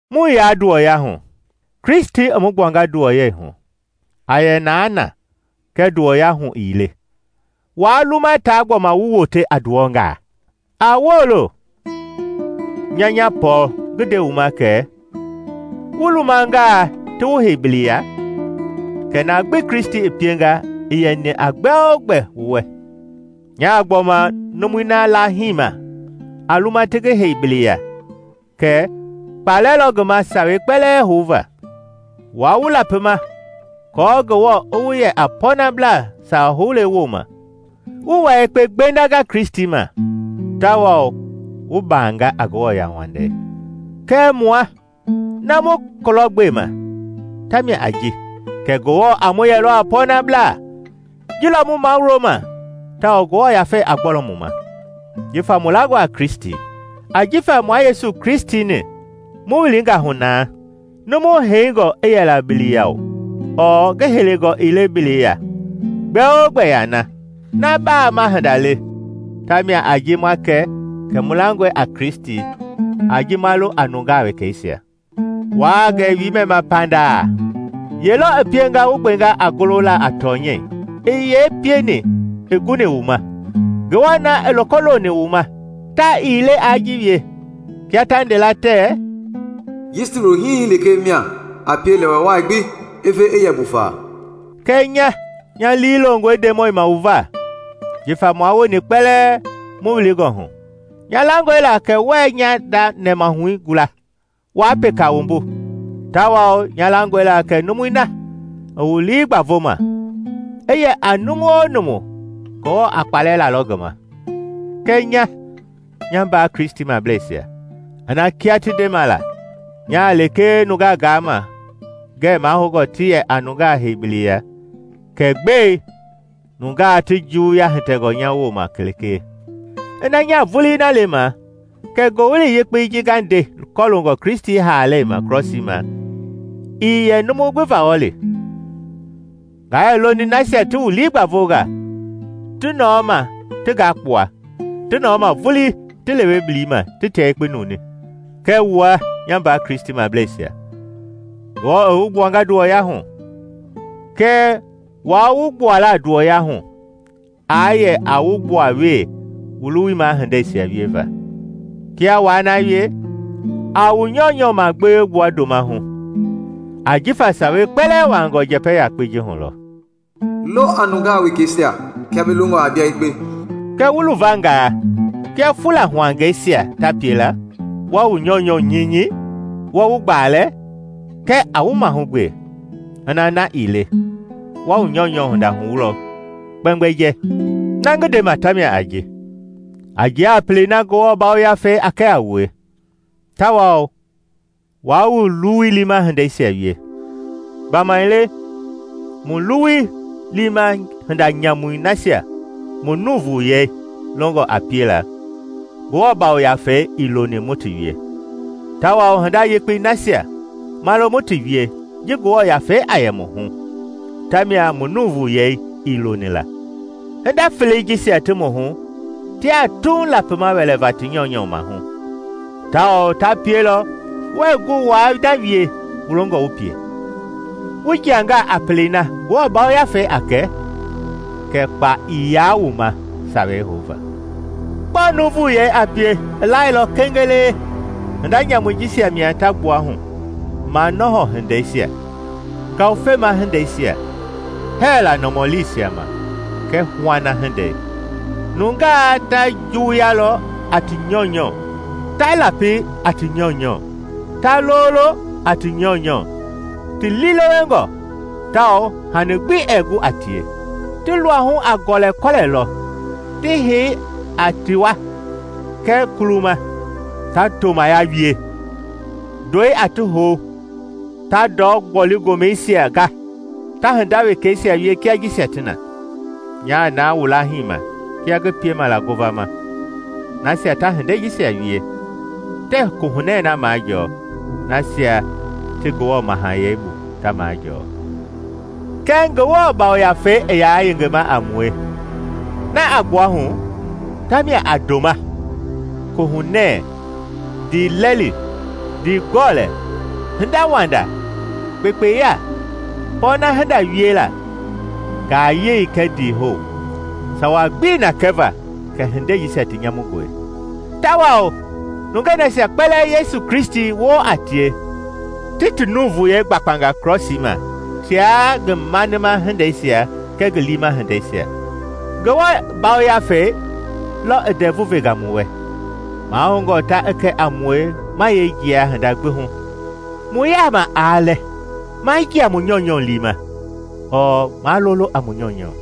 Mu yaa nduwɔyahu, Kristi i mu gbuanga nduwɔyɛi hu! A yɛ na naa, kɛɛ nduwɔya hu ii le, waa luma taa gbɔma wu wote a nduwɔngaa. A woolo! Nya nya, Pɔɔl ngi nde wu ma kɛ wu lumangaa ti wu hei bili, ya kɛ na gbi Kristi pienga ii yɛni a gbɛ-o-gbɛ wu wɛ. Nyaa gbɔma numui na laahima a luma ti ngi hei bili ya kɛ kpa lɔ ngi ma Sawei kpɛlɛɛ houva. Wua wu lapima aako Ngewɔ i wu yɛ a pɔɔnablaa sawa houle wooma, wu wua yekpe gbendanga Kristi ma tawao wu baanga a Ngewɔ yauwandei. Kɛɛ mua, na mu kulɔgbema ta mia a ji kɛ Ngewɔ a mu yɛlɔ a pɔɔnablaa; ji lɔ mu mawuloma tawao Ngewɔ Yafei a gbɔlɔ mu ma, jifa mu langɔ a Kristi. Ajifa mua Yesu Kristi-ni mu wilingɔ hu yɛngaa la, numu heingɔ i yɛla bili ya ɔɔ ngi heingɔ ii le bili ya, gbɛ-o-gbɛ yaa na. Na baama hinda le ta mia a ji ma kɛ kɛ mu langɔe a Kristi a ji ma lo a nungaa wekeisia. Wuaa gɛ wiimɛ ma pandaa! Ye lɔ i pienga wu gbenga a golo la a tɔnyɛi? I yee pieni i guni wu ma? Ngewɔ na i loko loni wu ma ta ii le aa ji wie. Kia ta nde la tɛɛ, “Yisti wulo hii lekee mia a pie lɛwɛ wai gbi i ve i yɛ buufa.” Kɛɛ nya nya lii longɔe Ndemɔi ma wu va. Jifa mua wueni kpɛlɛɛ mu wilingɔ hu, nya langɔe la kɛ wuɛɛ nya nda nɛmahui gula waa peka wumbu tawao nya langɔe la kɛ numui na i wu lii gbavoma, i yɛ a numu-o-numu, Ngewɔ a kpaalɛ lalɔ ngi ma. Kɛɛ nya, nya mbaa Kristimableisia, ina kia ti ndema la, nyaa lekee nungaa gaama ngɛ mahoungɔ ti yɛ a nungaa hei bili ya, kɛ gbɛe nungaa ti juwuya hitɛngɔ nya wooma lekee? Ina nyaa vulii na lema, kɛ Ngowili Yekpei ji nga nde kɔloongɔ Kristi haalei ma krɔsii ma ii yɛ numu gbi vawɔli. Nga yɛ loni nasia ti wu lii gbavoma ti nɔɔ ma ti ngakpua; ti nɔɔ ma vulii ti lewe bili ma ti tia yekpe nuuni. Kɛɛ wua, nya mbaa Kristimableisia, Ngewɔ i wu gbuanga nduwɔya hu. Kɛɛ waa wu gbuala nduwɔyahu aa yɛ a wu gbuawee wu luwui ma hindeisia wieva. Kia waa na wie, a wu nyɔunyɔ magbewe gbua ndoma hu. Ajifa Sawei kpɛlɛɛ wuaangɔ njɛpɛ yakpɛi ji lɔ hu; “Lo a nungaa wekeisia kia bi longɔ a bia yekpe.” Kɛɛ wu luvangaa kia fulahuangɛisia ta pie la, wa wu nyɔunyɔ nyinyi, wa wu gbaalɛ, kɛ a wu mahugbe, ina na ii le wa wu nyɔunyɔ hinda huwulɔ kpɛmgbɛjɛɛ. Na ngi ndema ta mia a ji: A jia a pelei na Ngewɔ Yafei a kɛ a wue, tawao waa wu luwui liima hindeisia wie. Gbamaile mu luwui liima hinda nyamui nasia mu nuuvuyei longɔ a piela, Ngewɔ Yafei ii loni mu ti wie; tawao hinda yekpei nasia ma lo mu ti wie ji Ngewɔ Yafei a yɛ mu hu, tamia mu nuuvuyei ii loni la. Hinda felei jisia ti mu hu tiaa Tuuŋ lapima wɛlɛva ti nyɔunyɔ maahu tawao ta pielɔ wuɛɛ gu waa na wie wu longɔ wu pie. Wu jiangaa a pelei na Ngewɔ Yafei a kɛ, kɛ kpa ii yaa wu ma sawei houva. Gbɔɔ nuuvuyei a pie i lailɔ kengelee, hinda nyamui jisia mia ta gbua hu: manɔhɔ hindeisia, ngawufema hindeisia; hɛɛla nɔmɔliisia ma kɛɛ huana hindei. Nunga ta juwuyalɔ a ti nyɔunyɔ, ta lapi a ti nyɔunyɔ; ta lololɔ, ti liilewengɔ tawao hani gbi ɛɛ gu a tie. Ti luahu a gɔlɛkɔlɛlɔ ti hei a tiwa kɛɛ kuluma; ta tomaya wie, ndɔi a ti hou, ta ndɔ-gboli-gomɛisia ga, ta hinda wekeisia wie kia jisia ti na. Nyaa na wu laahima kia ngi pienga la ngovama, nasia ta hindei jisia wie tɛɛ Kohunɛ na majɔɔ nasia ti Ngewɔ Mahayɛi bu ta majɔɔ. Kɛɛ Ngewɔ Yafei i yaa yengema a mue, na a gbua hu tamia a ndoma, kohunɛ, ndiilɛli, ndiigɔlɛ, hindawanda, kpekpeya, pɔɔna hinda wiela, ngayei kɛɛ ndiihou. Sawa gbii na kɛva kɛ hindei jisia ti nyamungɔ. Tawao nungei nasia kpɛlɛɛ Yesu Kristi woo a tie ti ti nuuvuyei gbakpanga krɔsii ma, tia ngi manima hindeisia kɛɛ ngi liima hindeisia. Ngewɔ Yafei lɔ i ndɛvui venga mu wɛ, mahoungɔ ta i kɛ a mue ma yee jia hinda gbi hu. Mu yaama aa lɛ, maa jia mu nyɔunyɔ liima, ɔɔ maa lolo a mu nyɔunyɔ.